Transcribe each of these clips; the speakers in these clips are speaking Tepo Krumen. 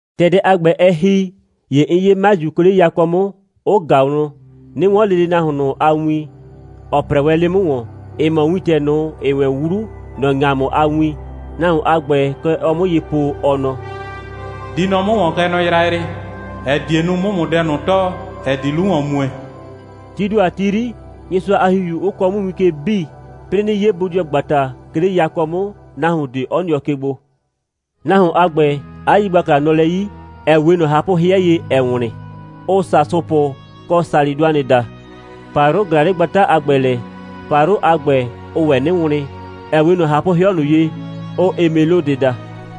‑Tɛ dɛ a ‑gbɛ, ɛ ‑hi, ‑ye 'n 'ye 'maju, 'ke 'le yakɔ 'mʋ, 'ʋ ꞊ga wlɔn, 'nɩ 'wɔn lele nahuon ꞊nʋ a win, ‑ɔ 'prɛɛ wɛn 'le 'mʋ ‑wɔn. Ɩ mɔ wintɛ ꞊nʋ, ‑ɛɛ wɛn 'wlu, ‑nɔ ‑ŋamʋ a win. Nahuon a ‑gbɛ, kɛ ɔɔ 'mʋ ye po, ɔ nɔ: «Di nɔ 'mʋ ‑wɔn, kɛ nɔ yrayrɩ, ‑ɛ die nu, 'mʋ ‑mʋ dɛ ꞊nʋ tɔɔ, ‑ɛ di 'lu ‑wɔn mue.» Tii ‑do a ti 'yri, Nyɩsʋa a ‑Hihiu 'ʋ kɔɔ 'mʋ win ke 'bii, 'plɩɩ 'nɩ 'ye bodɩɔgbata, 'ke 'le yakɔ 'mʋ, nahuon ꞊de 'ɔ nɩɔ ke gbo. Nahuon a ‑gbɛ, 'a yigbakla nɔ lɛ 'yi, ‑ɛ 'we ꞊nɔ ꞊hapʋ'hɩɛ ye, ‑ɛɛ wlɩn, ʋʋ sasʋpʋ kɔ salɩdʋanɩ daa. ‑Payrʋ ꞊glaa 'le gbata a ‑gbɛ lɛ. ‑Payrʋ a ‑gbɛ, ʋʋ ‑wɛ 'nɩ wlɩn, ‑ɛ 'we ꞊nɔ ꞊hapʋ'hɩɔ ꞊nʋ ye, ʋʋ emelodɩ daa.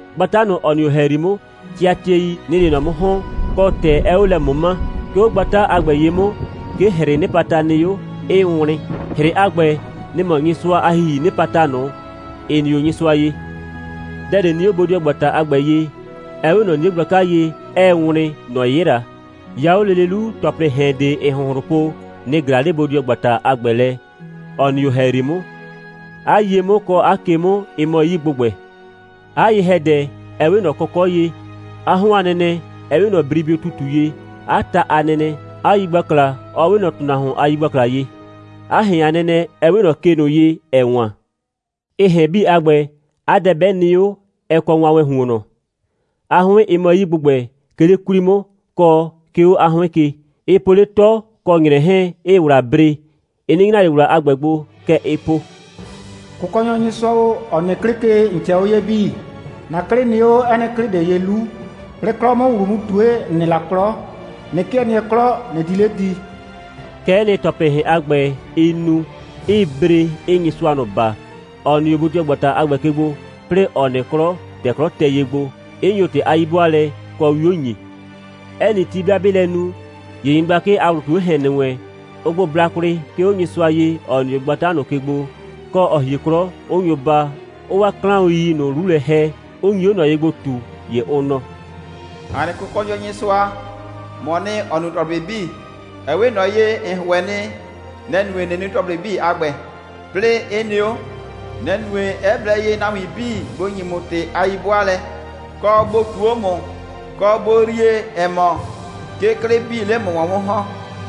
Gbata ꞊nʋ, ‑ɔ nɩ 'o ‑hɛyri 'mʋ, tɩatɩɛi, nɩ‑ɩ 'le ꞊nɔ 'mʋ ‑hɔn, kɔ, ‑tɛ 'ɛɛ 'o lɛ ꞊mʋma. 'Ke 'o gbata a ‑gbɛ ye 'mʋ, 'ke ‑hrɩɩ 'nɩpata nɩ 'o, 'ɩɩ wlɩn. ‑Hrɩ a ‑gbɛ, nɩ‑ mɔ Nyɩsʋa a ‑Hihii 'nɩpata ꞊nʋ, ‑ɩ nɩ 'o Nyɩsʋa ye. Dɛ ꞊de nɩ 'o bodɩɔgbata a ‑gbɛ ye, 'ɛ 'we ꞊nɔ 'nie gblaka ye, 'ɛɛ wlɩn, ‑nɔ 'yɩla. 'Ya 'o lele 'lu, ‑tɔplɩɩ ‑hɛn ꞊de, ‑ɩɩ ‑hʋnhlʋn po, nɩ‑ ꞊glaa 'le bodɩɔgbata a ‑gbɛ lɛ, ‑ɔ nɩ 'o ‑hɛyri 'mʋ. 'A ye 'mʋ, kɔ 'a ke 'mʋ, ɩ mɔ 'yii ‑gbʋgbɛ. 'A ye‑hɛdɛ, ɛ 'we ꞊nɔ kɔkɔ' ye, 'a 'hɔn a nɛnɛ 'ɛ 'we ꞊nɔ bribɩʋ ‑tutu ye, 'a ta a nɛnɛ, 'a yigbakla 'ɔ 'we ꞊nɔ ‑tʋnahuon a yigbakla ye, 'a ‑hɛn a nɛnɛ 'ɛ 'we ꞊nɔ ke ꞊nʋ ye, ‑ɛɛ wan. Ɩ ‑hɛn 'bii a ‑gbɛ, 'a dɛ 'bɛ nɩ 'o, ɛ kɔ wanwɛɛn ‑huonnɔ. 'A 'hʋɩn, ɩ mɔ 'yii ‑gbʋgbɛ, 'ke 'le 'kwli 'mʋ, kɔ, 'ke 'o 'a 'hʋɩn ke. Ɩ po 'le 'tɔ kɔ ‑nyrɛ 'hɛɛn, 'ɩɩ ‑wla bre. Ɩ 'nɩ nyra ꞊le ‑wla a ‑gbɛ gbo. Kɛ ɩɩ po: «Kʋkɔnyɔ Nyɩsʋa o, ‑ɔ nɩ 'klɩ ke, ‑n ꞊cɛɛ 'o ye 'bii. ‑Na 'klɩ nɩ 'o 'ɛ nɩ 'klɩ ꞊de ye 'lu. 'Plɩɩ 'klɔ 'mʋ ‑wlu mu ꞊tue, ‑n nɩ la 'klɔ, ꞊nɩ 'kɩɛ nɩɛ 'klɔ, ꞊nɩ di 'le di.» Kɛ'ɛ nɩ, ‑tɔplɩɩ ‑hɛn a ‑gbɛ, ɩɩ nu, 'ɩɩ bre, 'ɩɩ Nyɩsʋa ꞊nʋ baa, ‑ɔ nɩ 'o bodɩɔgbata a ‑gbɛ ke gbo, 'plɩɩ ‑ɔ nɩ 'klɔ, ‑tɛ 'klɔ tɛ ye gbo, 'ɩ nyo ‑tɩ a 'yi'bʋaalɛ kɔ 'wio ‑nyi. 'Ɛ nɩ ti, 'bɩa 'bɩɩ lɛ nu, ‑ye nyɩgblakɩ a ‑wlʋ ꞊tu 'o ‑hɛn ‑nɩ wɛn, ʋʋ gbo bla kwlɩ, 'ke 'o Nyɩsʋa ye, ‑ɔ nɩ 'o gbata ꞊nʋ ke gbo, kɔ, ‑ɔ hie 'klɔ, 'ʋ nyo baa, 'ʋʋ 'waa 'klaʋn.i ꞊nʋ 'lu lɛ ‑hɛ, 'ʋ nyi 'o ꞊nɔ ye gbo ꞊tu, ‑ye ʋ nɔ: «‑A nɩ Kʋkɔnyɔ Nyɩsʋa, ‑mɔɔ nɩ, ‑ɔ nu ‑tɔplɩ 'bii. Ɛ 'we ꞊nɔ ye, ‑n ‑hʋɛ nɩ, nɛ‑ nue, ꞊nɩ nu ‑tɔplɩ 'bii a ‑gbɛ, 'plɩɩ 'ɩ nɩ 'o. Nɛ‑ nue, 'ɛ blɛ ye nahuin 'bii bʋ ‑nyi ‑mʋ ‑tɩ a 'yi'bʋaalɛ, kɔ, bʋ ꞊tuu 'o ‑mʋ, kɔ, bʋ yrie, ‑ɛ mɔ, 'ke 'klɩ 'bii 'le ‑mʋ ‑wɔn 'mʋ ‑hɔn.»